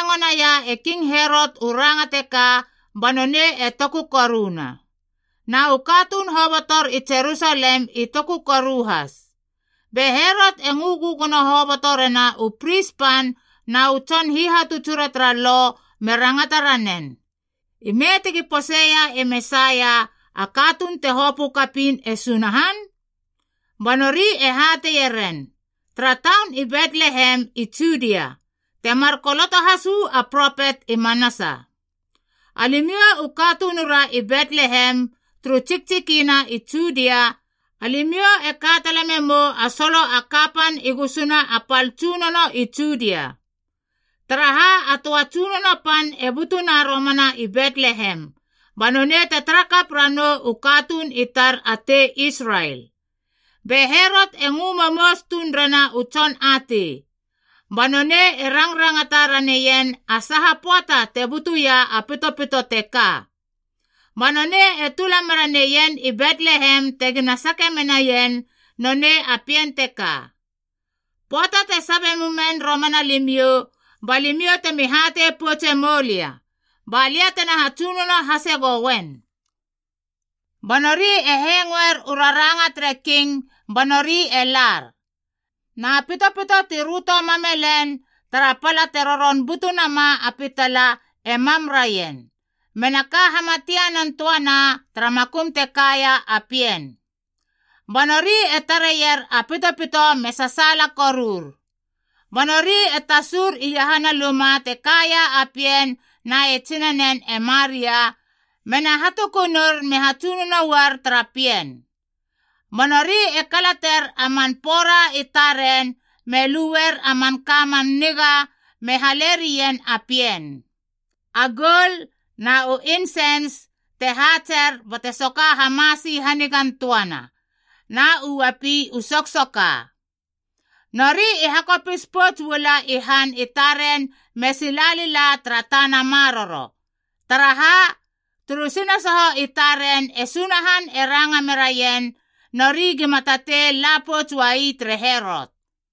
Pöata te hengo naia e King Herot u ranga teka, ba nonei e toku koruna. Na u katuun hobotor i Jerusalem i toku koru has. Be Herot e ngö gögono hoboto rena u pris pan, na u tson hihatutsura tara Lob me rangata ranen, “Ime tegi poseia e Mesaia, a katuun te hopö kapiin e Sunahan?” Ba nori e hateieren, “Tara taun i Betlehem i Judia, temar koloto has uu a propet i manasa: ‘Alimiou u katunura i Betlehem, turu tsiktsikina i Judia, alimiou e ka tala memou a solo a kapan i gusuna a pal tsunono i Judia. Taraha, a töa tsunono pan e butuna romana i Betlehem, ba nonei te tarakap ranou u katuun i tar a tei Israel.’” Be Herot e ngö momous tuun rena u tson atei. Ba nonei e rangrangata raneien a saha pöata te butuia a pitopito teka. Ba nonei e tula mera neien i Betlehem tegina sake menaien nonei a pien teka. “Pöata te sabie mumen romana limiou, ba limiou temi hatei poutse moulia. Ba lia tena hatsunono hase gouen.” Ba nori e hengoer u raranga tere king ba nori e lar. Na pitopito ti röto mam me len tara pala te roron butu nama a pitala e mam raien, mena ka hamatianan töana tara makum te kaia a pien. Ba nori e tareier a pitopito me sasaala korur. Ba nori e tasur iahana luma te kaia a pien na e tsinanen e Maria, mena hatukunur me hatsunono uar tara pien. Ba nori e kalater a man pora i taren me luer a manka a man niga me halerien a pien: a goul na u insens te haatser bate soka hamasi hanigan töana, na u uapi u soksoka. Nori i hakopis pouts uala i han i taren me sila lila tara tana maroro. Taraha, turu sinasoho i taren e Sunahan e ranga meraien, nori gima tatei la pouts uai tere Herot.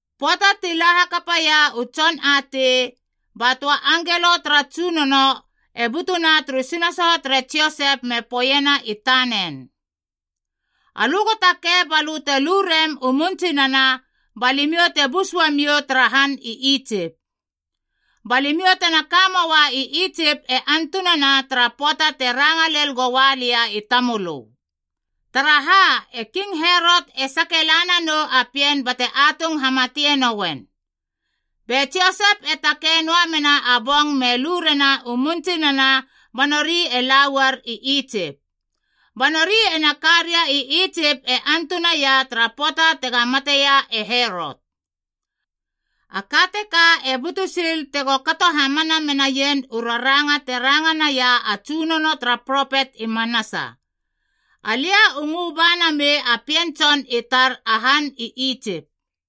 Pöata ti la hakapaia u tson atei, ba töa angelo tara Tsunono e butuna turu sinasoho tere Josep me poeiena i tanen, “Alö go takei ba lö te lu rem u mun tsinana, ba limiou te bus uamiou tara han i Itsip. Ba limiou tena ka möa i Itsip e antunana tara pöata te ranga lel goa lia i tamölö. Taraha, e King Herot e sake la nanou a pien bate atung hamatie nouen.” Be Josep e takei noa mena a bong me lu rena u mun tsinana ba nori e la uar i Itsip. Ba nori ena ka ria i Itsip e antunaia tara pöata tega mateia e Herot. A ka teka e butu sil tego kato hamana menaien u raranga te ranga naia a Tsunono tara propet i manasa: “Alia u ngö ba namei a pien tson i tar a han i Itsip.”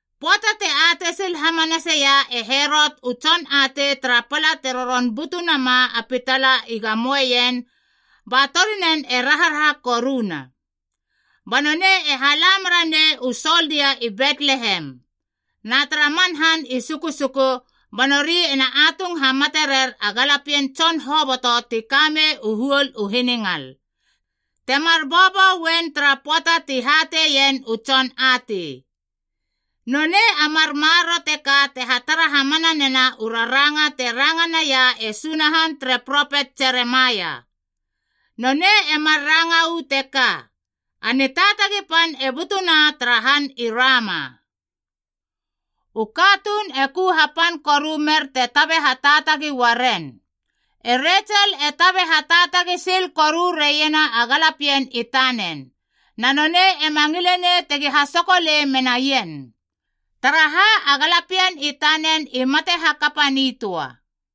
Pöata te atei sil hamanaseia e Herot u tson atei tara pala te roron butu nama a pitala i gamoeien, ba torinen e raharaha koruna. Ba nonei e hala meranei u soldia i Betlehem, na tara man han i sukusuku, ba nori ena atung hamate rer a galapien tson hoboto ti kamei u huol u hiningal,c temar bobo uen tara pöata ti hateien u tson atei. Nonei a mar maroro teka e hatara hamana nena u raranga te ranga naia e Sunahan tere propet Jeremaia. Nonei e mar ranga uu teka, “A nitaatagi pan e butuna tara han i Rama. U katuun e ku hapan koru mer te tabe hataatagi uaren. E Retsel e tabe hataatagi sil koru reiena a galapien i tanen. Na nonei ema ngilenei tegi hasokolei menaien. Taraha, a galapien i tanen i mate hakapa nitöa.”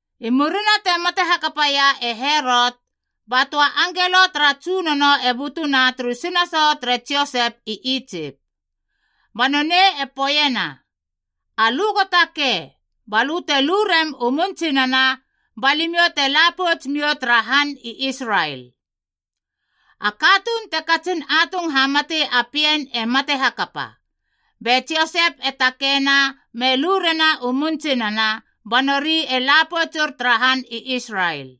I murina te mate hakapaia e Herot, ba töa angelo tara Tsunono e butuna turu sinasoho tere Josep i Itsip. Ba nonei e poeiena, “Alö go takei, ba lö te lu rem u mun tsinana, ba limiou te la pouts miou tara han i Israel. A katuun te katsin atung hamati a pien e mate hakapa.” Be Josep e takeina me lu rena u mun tsinana, ba nori e la poutsur tara han i Israel.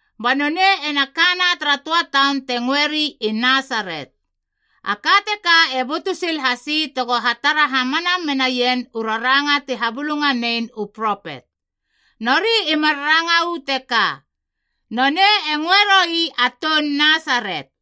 Ba nonei ena kana tara töa taun te ngöeri i Nasaret. A ka teka e butu sil hasi tego hatara hamana menaien u raranga ti habulunganein u propet. Nori i mar ranga uu teka, “Nonei e ngöe roi a toun Nasaret.”